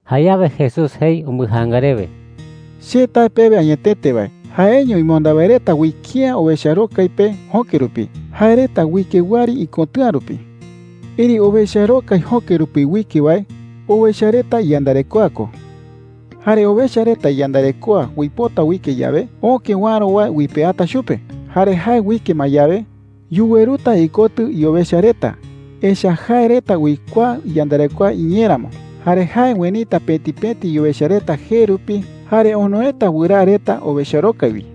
Jayawe Jesús jei umbɨjaanga rewe: “Che tae pewe añetete wae, jaeño imonda wae reta uike’ä owecharokai pe jöke rupi. Jae reta uike wɨari ikotɨ̈a rupi,” jei. “Erëi owecharokai jöke rupi uike wae, owecha reta iyandarekoa ko,” jei. “Jare owecha reta iyandarekoa uipota uike yawe, öke uäro wae uipeata chupe. Jare jae uike ma yawe, yuweruta ikotɨ iowecha reta, echa’ä jae reta uikuaa iyandarekoa iñee ramo. Jare jae uenita pëti pëti iowecha reta jee rupi jare onoeta wɨraa reta owecharokai wi,” jei.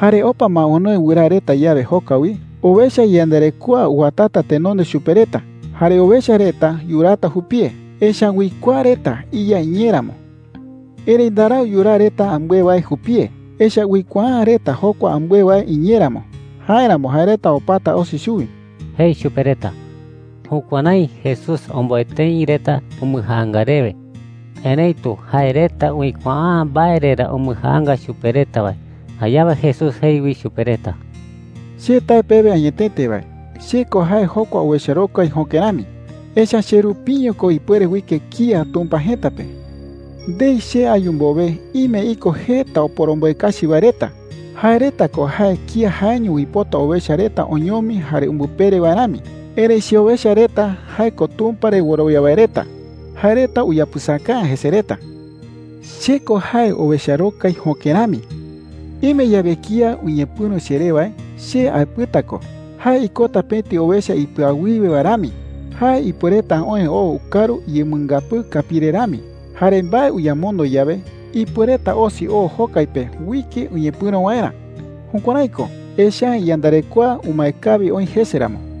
“Jare opa ma onoe wɨraa reta yawe jokai wi, owecha iyandarekoa uwatata tenonde chupe reta jare owecha reta yuraata jupie, echa’ä uikuaa reta iya iñee ramo,” jei. “Erëi ndarau yuraa reta ambɨe wae jupie, echa’ä uikuaa’ä reta jokua ambɨe wae iñee ramo. Jáeramo jae reta opata osi chuwi,” jei chupe reta. Jukuärái Jesús omboe tëi reta umbɨjaanga rewe, erëitu jae reta uikuaa’ä mbae re ra umbɨjaanga chupe reta wae. Jayawe Jesús jei wi chupe reta: “Che tae pewe añetete wae, che ko jae jokua owecharokai jöke rami. Echa’ä che rupiño ko ipuere uike kía Tumpa jëta pe,” jei. “Ndei che ayu mbowe, ime iko jeta oporomboe kachi wae reta. Jae reta ko jae kía jaeño uipota owecha reta oñomi jare umbɨpere wae rami. Erëi cheowecha reta – jae ko Tumpa re wɨrowia wae reta – jae reta uyapɨsaka’ä jese reta,” jei chupe reta. “Che ko jae owecharokai jöke rami,” jei. “Ime yawe kía uñepɨ̈ro cheré wae, che aepɨta ko. Jae ikota pëti owecha ipɨawiwe wae rami. Jae ipuereta oë oo ukaru uyemɨngapɨɨ kapii re rami. Jare mbae uyamondo yawe, ipuereta osi oo jokai pe uike uñepɨ̈ro waerä. Jukuärái ko, echa’ä iyandarekoa umae kawi oï jese ramo,” jei chupe reta.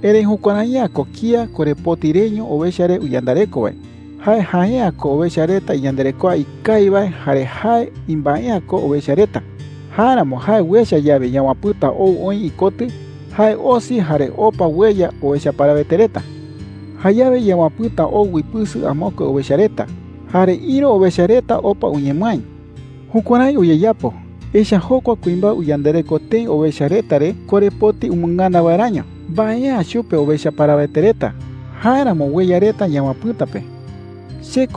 “Erëi jukuärai’ä ko kía korepoti reño owecha re uyandareko wae. Jae jae’ä ko owecha reta iyandarekoa ikawi wae jare jae imbae’ä ko owecha reta. Jáeramo jae uecha yawe yawapɨ̈ta ou oï ikotɨ, jae osi jare opa ueya owecha parawete reta. Jayawe yawapɨ̈ta ou uipɨsɨ amokue owecha reta, jare ïru owecha reta opa uñemɨái,” jei. “Jukuärái uyeyapo, echa’ä jokua kuimbae uyandareko tëi owecha reta re korepoti umɨngana waeräño. Mbae’ä chupe owecha parawete reta. Jáeramo ueya reta yawapɨ̈ta pe,” jei.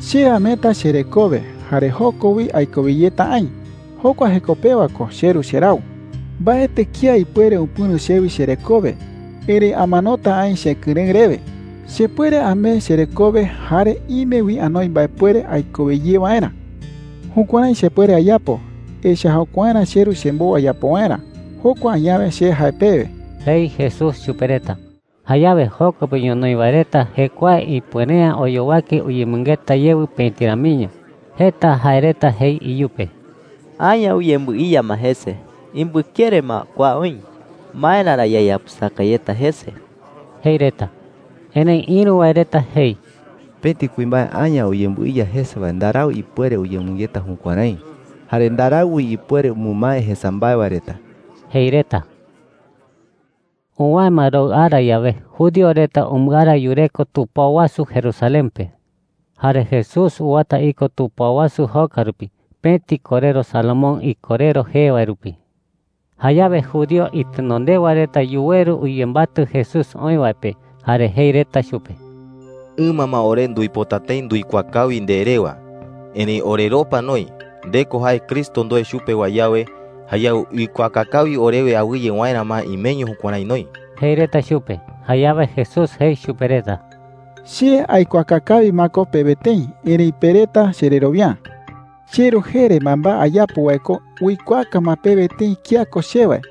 “Che ameeta cherekowe jare joko wi aikowe yeta aï. Jokua jeko pewa ko cheRu cherau. Mbaetɨ kía ipuere upɨ̈ro chewi cherekowe, erëi amanota aï chekɨrëɨ rewe. Chepuere amee cherekowe, jare ime wi anoi mbaepuere aikowe ye waerä. Jukuärái chepuere ayapo, echa’ä jokuaerä cheRu chembou ayapo waerä. Jokua añawe che jae pewe,” jei Jesús chupe reta. Jayawe joko pe ñonoï wae reta jekuae ipuere’ä oyowake uyemɨngeta yewɨ pëti ramiño. Jeta jae reta jei iyupe: “Aña uyembɨiya ma jese. Imbɨkere ma kua oï. ¿Maera ra yayapɨsaka yeta jese?” jei reta. Erëi ïru wae reta jei: “Pëti kuimbae aña uyembɨiya jese wae ndarau ipuere uyemɨngeta jukuärái. Jare ndarau wi ipuere umɨmae jesa mbae wae reta,” jei reta. Uwäe ma roɨ ara yawe, judío reta umbɨara yureko tupao wasu Jerusalén pe. Jare Jesús uwata iko tupao wasu joka rupi, pëti korero Salomón Ikorero jee wae rupi. Jayawe judío itenondewa reta yuweru uyembatɨ Jesús oï wae pe jare jei reta chupe: “Ɨma ma ore nduipota tëi nduikuaa kawi nde rewa, erëi oreropa noï. Nde ko jae Cristo ndoe chupe wae yawe, jayawe ikuaaka kawi orewe awɨye waerä ma imeño jukuärái noï,” jei reta chupe. Jayawe Jesús jei chupe reta: “Che aikuaaka kawi ma ko pewe tëi, erëi pe reta chererowia’ä,” jei chupe reta. “CheRu jee re mbaembae ayapo wae ko uikuaaka ma pewe tëi kía ko che wae.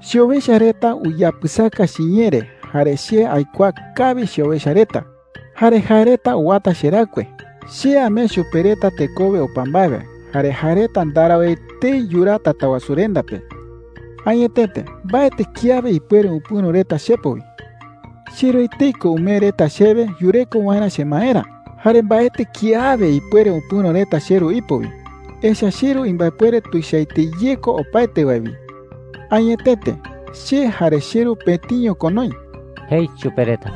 “Cheowecha reta uyapɨsaka chiñee re. Jare che aikuaa kawi cheowecha reta, jare jae reta uwata cheraɨkue. Che amee chupe reta tekowe opa mbae wae, jare jae reta ndarau etei yuraa Tatawasurenda pe. Añetete, mbaetɨ kiawe ipuere upɨ̈ro reta chepo wi,” jei chupe reta. “CheRu etei ko umee reta chewe yureko waerä chemaerä. Jare mbaetɨ kiawe ipuere upɨ̈ro reta cheRu ipo wi, echa’ä cheRu imbaepuere tuichaete ye ko opaete wae wi. Añetete, che jare cheRu pëtiño ko noï,” jei chupe reta.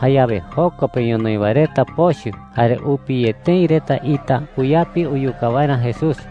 Jayawe joko pe ñonoï wae reta pochɨ jare upi ye tëi reta ita uyapi uyuka waerä Jesús.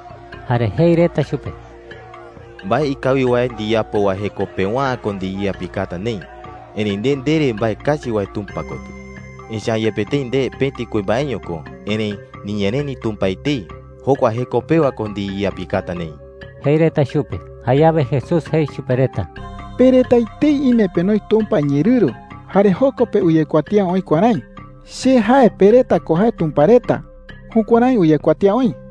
Jare jei reta chupe: “Mbae ikawi wae ndiyapo wae jeko pewa’ä ko ndiyeyapikata neï. Erëi nde ndere mbae kachi wae Tumpa kotɨ. Echa’ä yepe tëi nde pëti kuimbaeño ko, erëi niñereni Tumpa etei. Jokua jeko pewa ko ndiyeyapikata neï,” jei reta chupe. Jayawe Jesús jei chupe reta: “Pe reta etei ime penoi Tumpa iñeerɨru, jare joko pe uyekuatía oï kuärái: ‘Che jae pe reta ko jae tumpa reta.’ Jukuärái uyekuatía oï.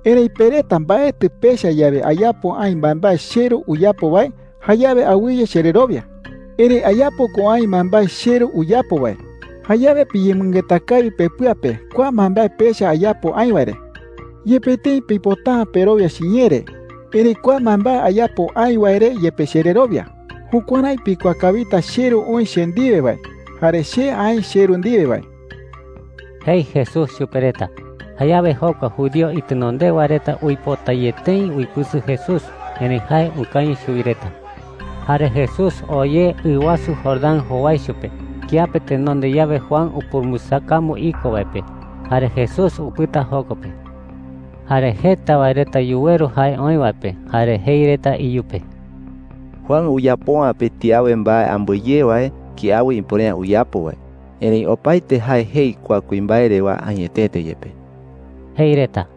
“Erëi pe reta mbaetɨ pecha yawe ayapo aï mbaembae cheRu uyapo wae, jayawe awɨye chererowia. Erëi ayapo ko aï mbaembae cheRu uyapo wae. Jayawe piyemɨngeta kawi pepɨa pe kua mbaembae pecha ayapo aï wae re,” jei chupe reta. “Yepe tëi pipota’ä perowia chiñee re, erëi kua mbaembae ayapo aï wae re yepe chererowia. Jukuärái pikuaa kawita cheRu oï che ndiwe wae, jare che aï cheRu ndiwe wae,” jei Jesús chupe reta. Jayawe jokua judío itenondewa reta uipota ye tëi uipɨsɨ Jesús, erëi jae ukañɨ chuwi reta. Jare Jesús oo ye ɨ wasu Jordán jowaicho pe kiape tenonde yawe Juan upurumbɨsakambu iko wae pe. Jare Jesús upɨta joko pe. Jare jeta wae reta yuweru jae oï wae pe jare jei reta iyupe: “Juan uyapo’ä pëti awe mbae ambɨe ye wae kiawe ipuere’ä uyapo wae. Erëi opaete jae jei kua kuimbae rewa añetete yepe,” jei reta.